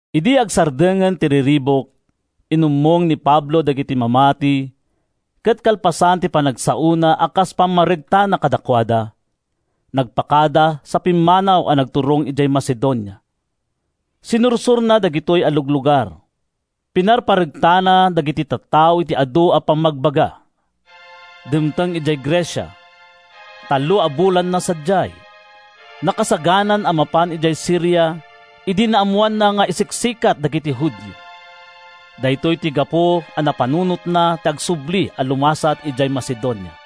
Idi agsardengen ti riribuk, inummong ni Pablo dagiti mamati ket kalpasan ti panagsaona a kas pammaregtana kadakuada, nagpakada sa pimmanaw a nagturong idiay Macedonia. Sinursorna dagitoy a luglugar. Pinarparegtana dagiti tattao iti adu a pammagbaga. Dimteng idiay Grecia. Tallo a bulanna sadiay. Nakasaganan a mapan idiay Siria idi naammoanna nga isiksikat dagiti Judio. Daytoy ti gapu a napanunotna ti agsubli a lumasat idiay Macedonia.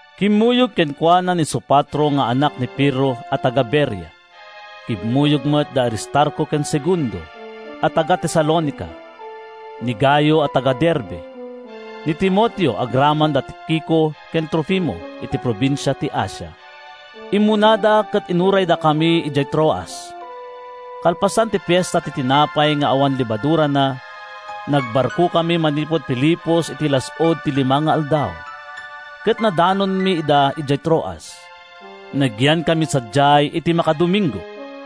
Kimmuyog kenkuana ni Sopatro nga anak ni Pirro a taga-Berea. Kimmuyog met da Aristarco ken Segundo a taga-Tesalonica, ni Gayo a taga-Derbe, ni Timoteo agraman da Tikico ken Trofimo iti probinsia ti Asia. Immunada ket inuraydakami idiay Troas. Kalpasan ti Fiesta ti Tinapay nga awan Lebadurana, nagbarkokami manipud Filipos iti las-ud ti lima nga aldaw, ket nadanonmi ida idiay Troas. Nagyankami sadiay iti makadomingo.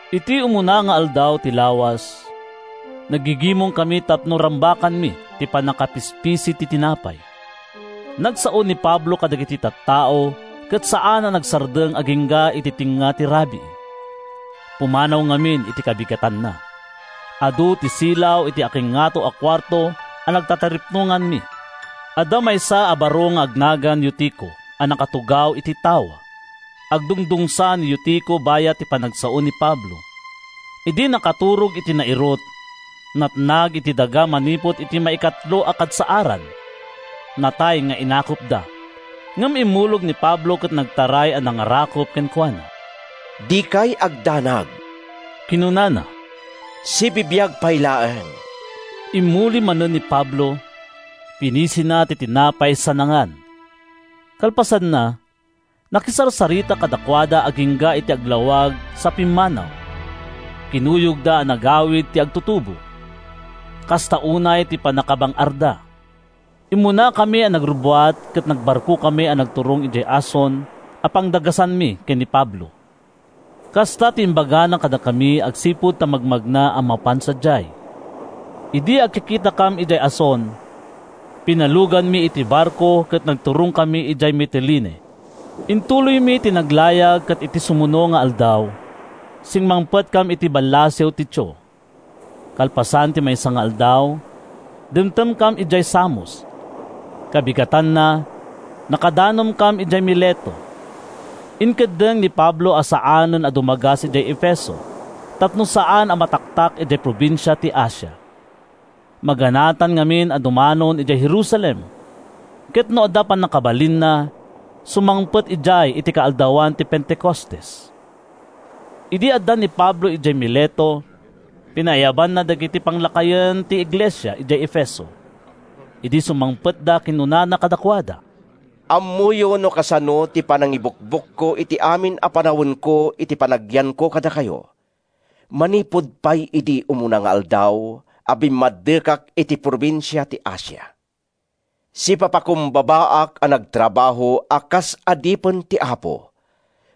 Iti umuna nga aldaw ti lawas, naggigimongkami tapno rambakanmi ti pannakapispisi ti tinapay. Nagsao ni Pablo kadagiti tattao ket saan a nagsardeng agingga iti tengnga ti rabii. Pumanaw ngamin iti kabigatanna. Adu ti silaw iti akingngato a kuarto a nagtataripnonganmi. Adda maysa a baro nga agnagan Eutico a nakatugaw iti tawa. Agdungdungsa ni Eutico bayat ti panagsao ni Pablo. Idi nakaturog iti nairut, natnag iti daga manipud iti maikatlo a kadsaaran. Natay nga inakupda. Ngem immulog ni Pablo ket nagtaray a nangarakup kenkuana. “Dikay agdanag,” kinunana, “sibibiag pay laeng!” Immuli manen ni Pablo, pinisina ti tinapay sa nangan. Kalpasanna, nakisarsarita kadakuada agingga iti aglawag sa pimmanaw. Kinuyogda a nagawid ti agtutubo. Kasta unay ti pannakabang-arda. Immunakami a nagrubbuat ket nagbarkokami a nagturong idiay Asson a pangdagasanmi ken ni Pablo. Kasta ti imbagana kadakami agsipud ta magmagna a mapan sadiay. Idi agkikitakam idiay Asson, pinaluganmi iti barko ket nagturongkami idiay Mitilene. Intuloymi ti naglayag ket iti sumuno nga aldaw, simmangpetkam iti ballasiw ti Chio. Kalpasan ti maysa nga aldaw, dimtengkam idiay Samos. Kabigatanna, nakadanonkam idiay Mileto. Inkeddeng ni Pablo a saanen a dumagas idiay Efeso tapno saan a mataktak idiay probinsia ti Asia. Maganatan ngamin a dumanon idiay Jerusalem, ket no adda pannakabalinna, sumangpet sadiay iti kaaldawan ti Pentecostes. Idi adda ni Pablo idiay Mileto, pinaayabanna dagiti panglakayen ti iglesia idiay Efeso. Idi sumangpetda, kinunana kadakuada, “Ammoyo no kasano ti panangibukbukko iti amin a panawenko iti panagyanko kadakayo manipud pay idi umuna nga aldaw a bimmaddekak iti probinsia ti Asia. Sipapakumbabaak a nagtrabaho a kas adipen ti Apo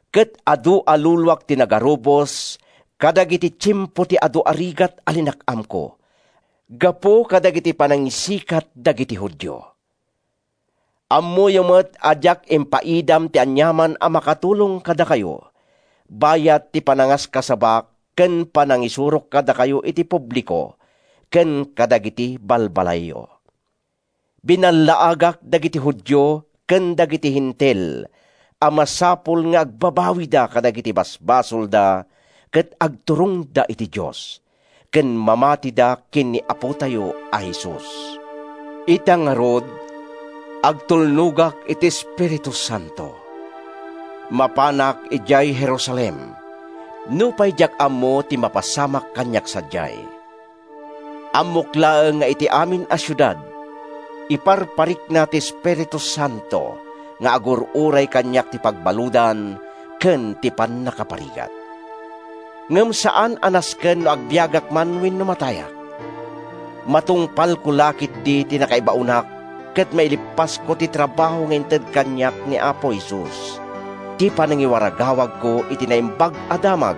ket adu a luluak ti nagarubos kadagiti tiempo ti adu a rigat a linak-amko gapu kadagiti panangisikat dagiti Judio. Ammoyo met a diak impaidam ti aniaman a makatulong kadakayo bayat ti panangaskasabak ken panangisursurok kadakayo iti publiko ken kadagiti balbalayyo. Binallaagak dagiti Judio ken dagiti Hentil a masapul nga agbabawida kadagiti basbasolda ket agturongda iti Dios, ken mamatida ken ni Apotayo a Jesus. Ita ngarud, agtulnogak iti Espiritu Santo. Mapanak idiay Jerusalem, nupay diak ammo ti mapasamak kaniak sadiay. Ammok laeng nga iti amin a siudad, iparparikna ti Espiritu Santo nga agur-uray kaniak ti pagbaludan ken ti pannakaparigat. Ngem saan a nasken no agbiagak man wenno matayak. Matungpalko la ketdi ti nakaibaonak ket maileppasko ti trabaho nga inted kaniak ni Apo Jesus—ti panangiwaragawagko iti Naimbag a Damag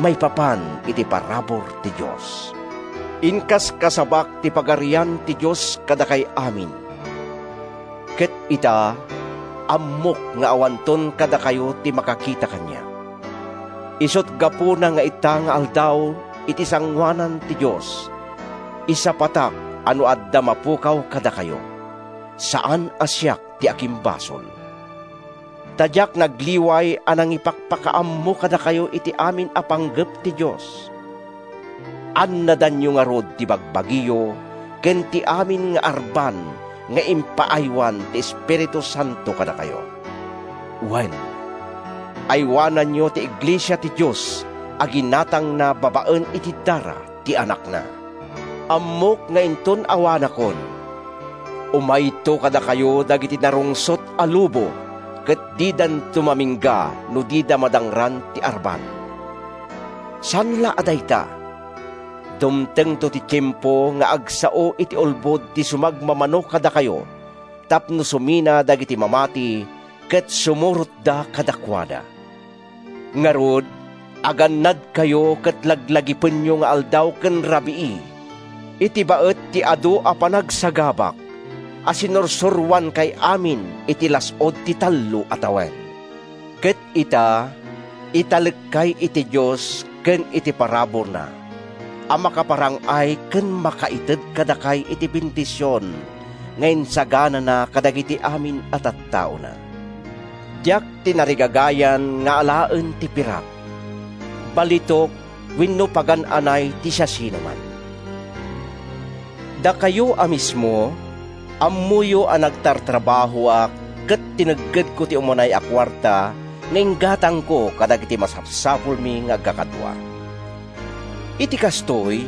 maipapan iti parabur ti Dios. “Inkaskasabak ti Pagarian ti Dios kadakay amin ket ita, ammok nga awanton kadakayo ti makakita kaniak. Isut’ gapuna nga ita nga aldaw, iti sangoanan ti Dios, isapatak a no adda mapukaw kadakayo, saan a siak ti akimbasol. Ta diak nagliway a nangipakpakaammo kadakayo iti amin a panggep ti Dios. Annadanyo ngarud ti bagbagiyo ken ti amin nga arban nga impaaywan ti Espiritu Santo kadakayo. Wen, aywananyo ti iglesia ti Dios a ginatangna babaen iti dara ti Anakna. Ammok nga inton awanakon, umayto kadakayo dagiti narungsot a lobo ket didanto mamingga no dida madangran ti arban. Saan la a dayta, dumtengto ti tiempo nga agsao iti ulbod ti sumagmamano kadakayo tapno sumina dagiti mamati ket sumurotda kadakuada. Ngarud, agannadkayo ket laglagipenyo nga aldaw ken rabii, iti baet ti adu a panagsagabak, a sinursuroankay amin iti las-ud ti tallo a tawen. “Ket ita, italekkay iti Dios ken iti paraburna a makaparang-ay ken makaited kadakay iti bendision nga insaganana kadagiti amin a tattaona. Diak tinarigagayan nga alaen ti pirak, balitok wenno pagan-anay ti siasinoman. Dakayo a mismo, ammoyo a nagtartrabahoak ket tineggedko ti umanay a kuarta nga inggatangko kadagiti masapsapulmi nga agkakadua. Iti kastoy,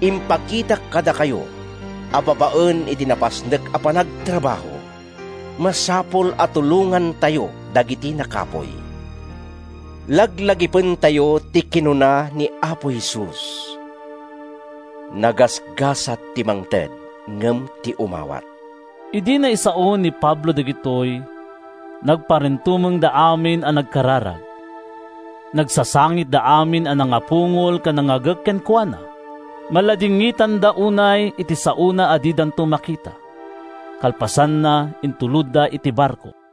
impakitak kadakayo a babaen iti napasnek a panagtrabaho, masapul a tulongantayo dagiti nakapuy. Laglagipentayo ti kinuna ni Apo Jesus, ‘Nagasgasat ti mangted ngem ti umawat.’” Idi naisaon ni Pablo dagitoy, nagparintumengda amin a nagkararag. Nagsasangitda amin a nangapungol ken nangagek kenkuana. Maladingitanda unay iti saona a didanton makita. Kalpasanna, intulodda iti barko.